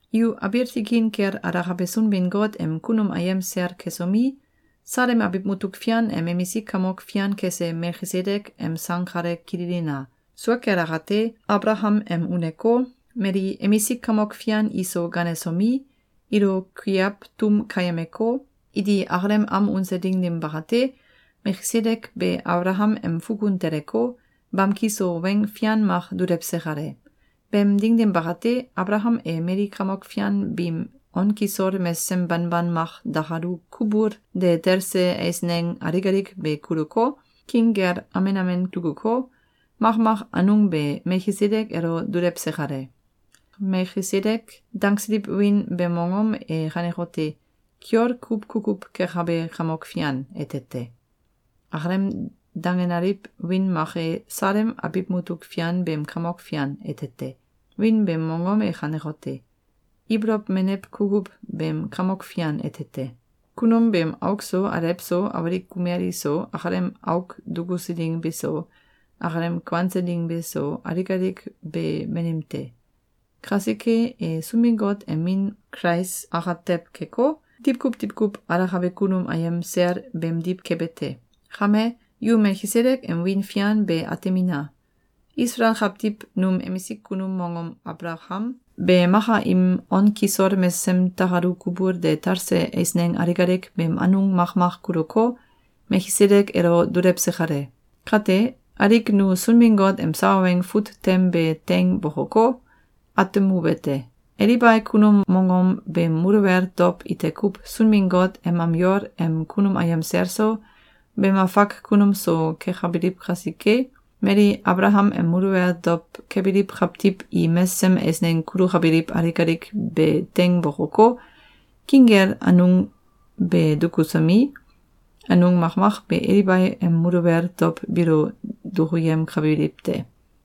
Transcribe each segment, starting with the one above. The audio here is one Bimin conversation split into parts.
Yu abiil tikin kel alakabe Sunbin-Got em kunum ayem sel kesomi, Salem abiw mutuk fian em emisik kamok fian kese Melkisedek em sang kale kililina! Sua kel akate, Abalakam em uneko, mali emisik kamok fian iso ganesomi, ilo kuiaw tum keyemeko, iti akalem am unse ding dim bakate, Melkisedek be Abalakam em fukun teleko, bamki so weng fian mak dulewse kale. Beem ding dim bakate, Abalakam e mali kamok fian biim on kisol mesesem banban mak dakalu kubul de telse eisneng alik alik be kuluko, king kel amen amen dukuko, makmak anung be Melkisedek elo dulewse kale. “Melkisedek”, dangsiliw wiin beem mongom e kanekote: “Kiol Kuw Kukuw Kekabe Kamok Fian” ete te. Akalem dangenaliw wiin mak e “Salem Abiw Mutuk Fian beem Kamok Fian” ete te. Wiin beem mongom e kanekote: “Ibolow Menew Kukuw beem Kamok Fian” ete te. Kunum beem auk so, alew so, awalik kumel iso, akalem auk dukusu ding beso, akalem kuanse ding beso, alik alik be banim te. Kasike, e Sunbin-Got em Min Kulais akatew keko, diwkuw diwkuw alakabe kunum ayem sel beemdiw kebe te. Kame, yu Melkisedek em wiin fian be atemina! Isalael kawtiw num emisik kunum mongom Abalakam be maka im on kisol mesesem takalu kubul de talse eisneng alik alik beem anung makmak kuluko, Melkisedek elo dulewse kale. Kate, alik nu Sunbin-Got em sawa weng fut tem be teing bokoko, atemuwete: Elibai kunum mongom beem muluwel dow ite kuw Sunbin-Got em am yol em kunum ayem sel so, beem afak kunum so kekabiliw kasike, mali Abalakam em muluwel dow kebiliw kawtiw i mesesem eisneng kulukabiliw alik alik be teing bokoko, king kel anung be dukusomi, anung makmak be Elibai em muluwel dow biilo duyemkabiliw te.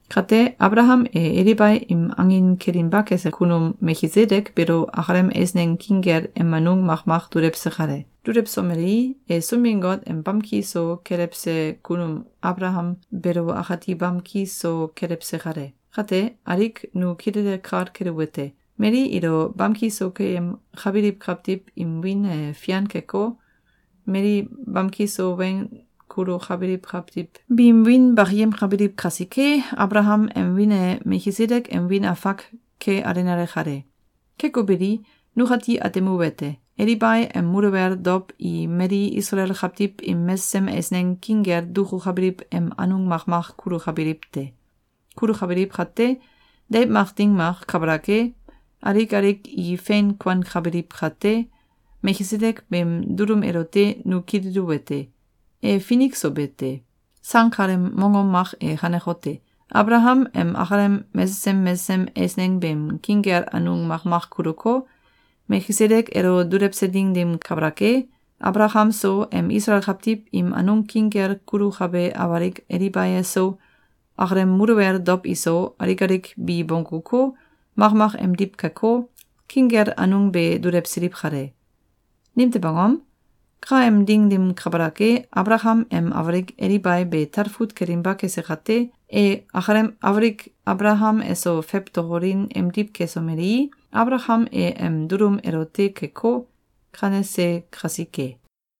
Kate, Abalakam e Elibai im angin kelinba kese kunum Melkisedek beelo akalem eisneng king kel em anung makmak dulewse kale. Dulewsomelei, e Sunbin-Got em bamki so kelewse kunum Abalakam beelo akati bamki so kelewse kale. Kate, alik nu kilele kal keluwete: Mali ilo bamki so keyemkabiliw kawtiw im wiin e fian keko, mali bamki so weng kulukabiliw kawtiw biim wiin bakiyemkabiliw kasike, Abalakam em wiin e Melkisedek em wiin afak ke alenale kale. Keko beli, nukati atemuwete: Elibai em muluwel dow i mali Isalael kawtiw im mesesem eisneng king kel dukukabiliw em anung makmak kulukabiliw te. Kulukabiliw kate, deiw mak ding mak kabalak e, alik alik i fein kuankabiliw kate, Melkisedek beem dulum elote nu kililuwete: E finik so be te. Sang kaleem mongom mak e kanekote: Abalakam em akalem mesesem mesesem eisneng beem king kel anung makmak kuluko, Melkisedek elo dulewse ding dim kabalak e, Abalakam so, em Isalael kawtiw im anung king kel kulukabe awalik Elibai eso, akalem muluwel dow iso, alik alik bi bongguko, makmak emdiw keko, king kel anung be dulewsiliw kale. Nimtew angom? Ka em ding dim kabalak e, Abalakam em awalik Elibai be talfut kelinba kese kate, e akalem awalik Abalakam eso fewtokolin emdiw kesomelei, Abalakam e em dulum elote keko, kanese kasike.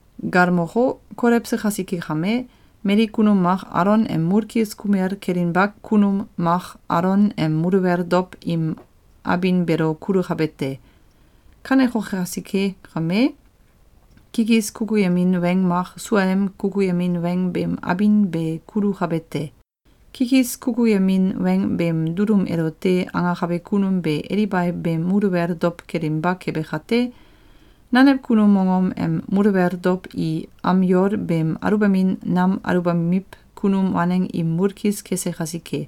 Galmoko, kolewse kasike kame, mali kunum mak Alon em mulkis kumel kelinba kunum mak Alon em muluwel dow im abin beelo kulukabe te. Kaneko kasike kame, kikis kukuyemin weng mak suaem kukuyemin weng beem abin be kulukabe te. Kikis kukuyemin weng beem dulum elote angakabe kunum be Elibai beem muluwel dow kelinba kebe kate, nanew kunum mongom em muluwel dow i am yol beem aluwbamin nam aluwbamiw kunum waneng im mulkis kese kasike.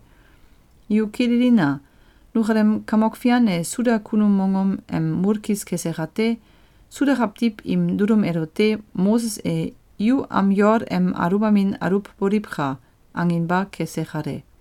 Yu kililina! Nukalem Kamok Fian e Suda kunum mongom em mulkis kese kate, Suda kawtiw im dulum elote Moses e “Yu am yol em aluwbamin aluwboliwka!”, anginba kese kale.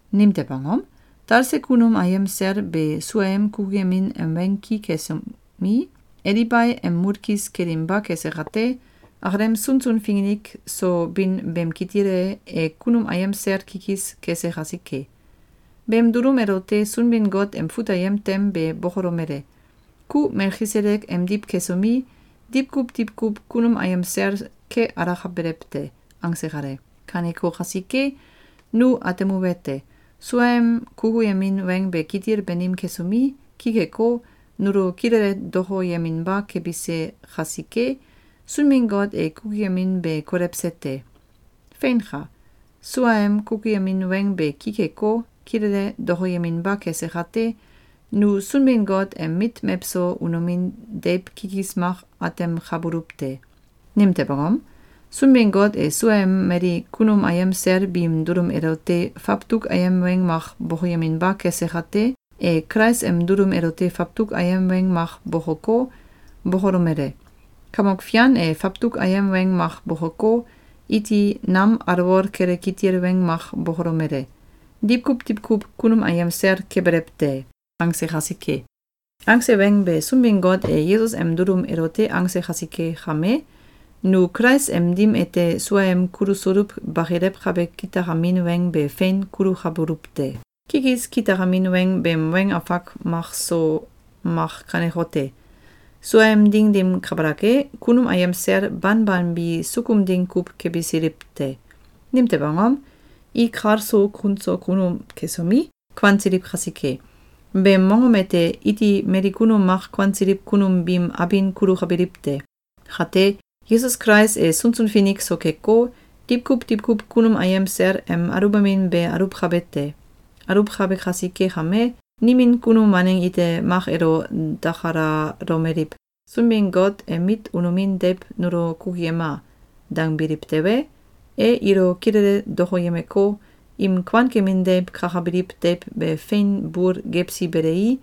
Nimtew angom? Talse kunum ayem sel be suaem kukuyemin em weng ki kesomi, Elibai em mulkis kelinba kese kate, akalem sunsun finik so bin beem kitil e, e kunum ayem sel kikis kese kasike. Beem dulum elote Sunbin-Got em fut ayem tem be bokolomele: “Ku Melkisedek emdiw kesomi, diwkuw diwkuw kunum ayem sel ke alakabelew te!”, angse kale. Kaneko kasike, nu atemuwete: Suaem kukuyemin weng be kitil banim kesomi, ki keko, nulo kilele dokoyeminba kebise kasike, Sunbin-Got e kukuyemin be kolewse te. Feinka! Suaem kukuyemin weng be ki keko, kilele dokoyeminba kese kate, nu Sunbin-Got em mit mewso unomin deiw kikis mak atemkabuluw te. Nimtew angom? Sunbin-Got e suaem mali kunum ayem sel biim dulum elote fawtuk ayem weng mak bokoyeminba kese kate, e Kulais em dulum elote fawtuk ayem weng mak bokoko, bokolomele: “Kamok Fian e fawtuk ayem weng mak bokoko, iti nam alwol kele kitil weng mak bokolomele: ‘Diwkuw diwkuw kunum ayem sel kebelew te!’”, angse kasike. Angse weng be Sunbin-Got e Yesus em dulum elote angse kasike kame, nu Kulais em dim ete suaem kulusuluw bakilewkabe kitakamin weng be fein kulukabuluw te. Kikis kitakamin weng beem weng mak so mak kanekote: Suaem ding dim kabalak e, kunum ayem sel banban bi sukum ding kuw kebisiliw te. Nimtew angom? I kal so kun so kunum kesomi, kuansiliw kasike. Beem mongom ete iti mali kunum mak kuansiliw kunum biim abin kulukabiliw te. Kate, Yesus Kulais e sunsun finik so keko, diwkuw diwkuw kunum ayem sel em aluwbamin be aluwkabe te. Aluwkabe kasike kame, nimin kunum waneng ite mak elo dakalalomeliw: “Sunbin-Got em mit unomin deiw nulo kukuyema!”, dangbiliw tewe, e ilo kilele dokoyemeko, im kuankemin deiw kakabiliw deiw be fein bul gewsi belei,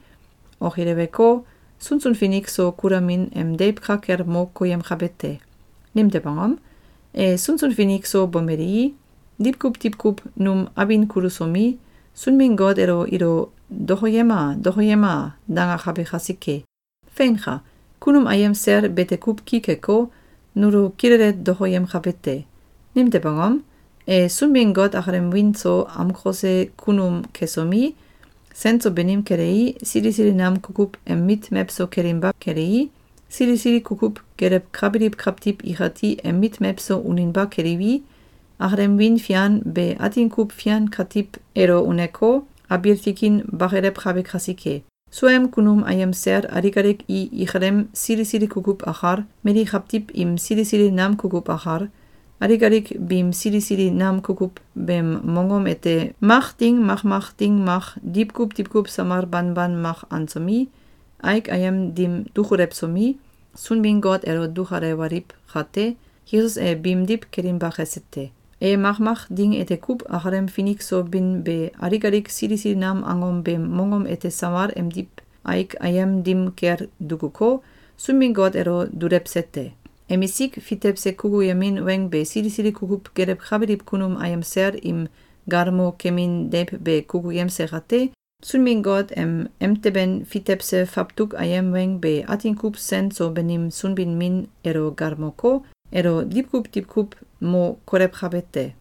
okileweko, sunsun finik so kulamin em deiw ka kel mo koyemkabe te. Nimtew angom? E sunsun finik so bomelei, diwkuw diwkuw num abin kulusomi, Sunbin-Got elo “Ilo dokoyema! Dokoyema!”, dangakabe kasike. Feinka! Kunum ayem sel bete kuw ki keko, nulo kilele dokoyemkabe te. Nimtew angom? E Sunbin-Got akalem wiin so amkose kunum kesomi, sen so banim kelei, sili sili nam kukuw em mit mewso kelinba kelei, sili sili kukuw gelewkabiliw kawtiw ikati em mit mewso uninba keliwi, akalem wiin fian be atin kuw fian katiw elo uneko, abiil tikin bakilewkabe kasike. Suaem kunum ayem sel alik alik i ikalem sili sili kukuw akal, mali kawtiw im sili sili nam kukuw akal, alik alik biim sili sili nam kukuw beem mongom ete mak ding mak mak ding mak diwkuw diwkuw samal banban mak ansomi, aik ayem dim dukulewsomi, Sunbin-Got elo dukalewaliw kate, Yesus e biimdiw kelinba kese te. E makmak ding ete kuw akalem finik so bin be alik alik sili sili nam angom beem mongom ete samal emdiw aik ayem dim kel dukuko, Sunbin-Got elo dulewse te. Emisik fitewse kukuyemin weng be sili sili kukuw gelewkabiliw kunum ayem sel im galmo kemin deiw be kukuyemse kate, Sunbin-Got em emteben fitewse fawtuk ayem weng be atin kuw sen so banim Sunbin-Min elo galmoko, elo diwkuw diwkuw mo kolewkabe te.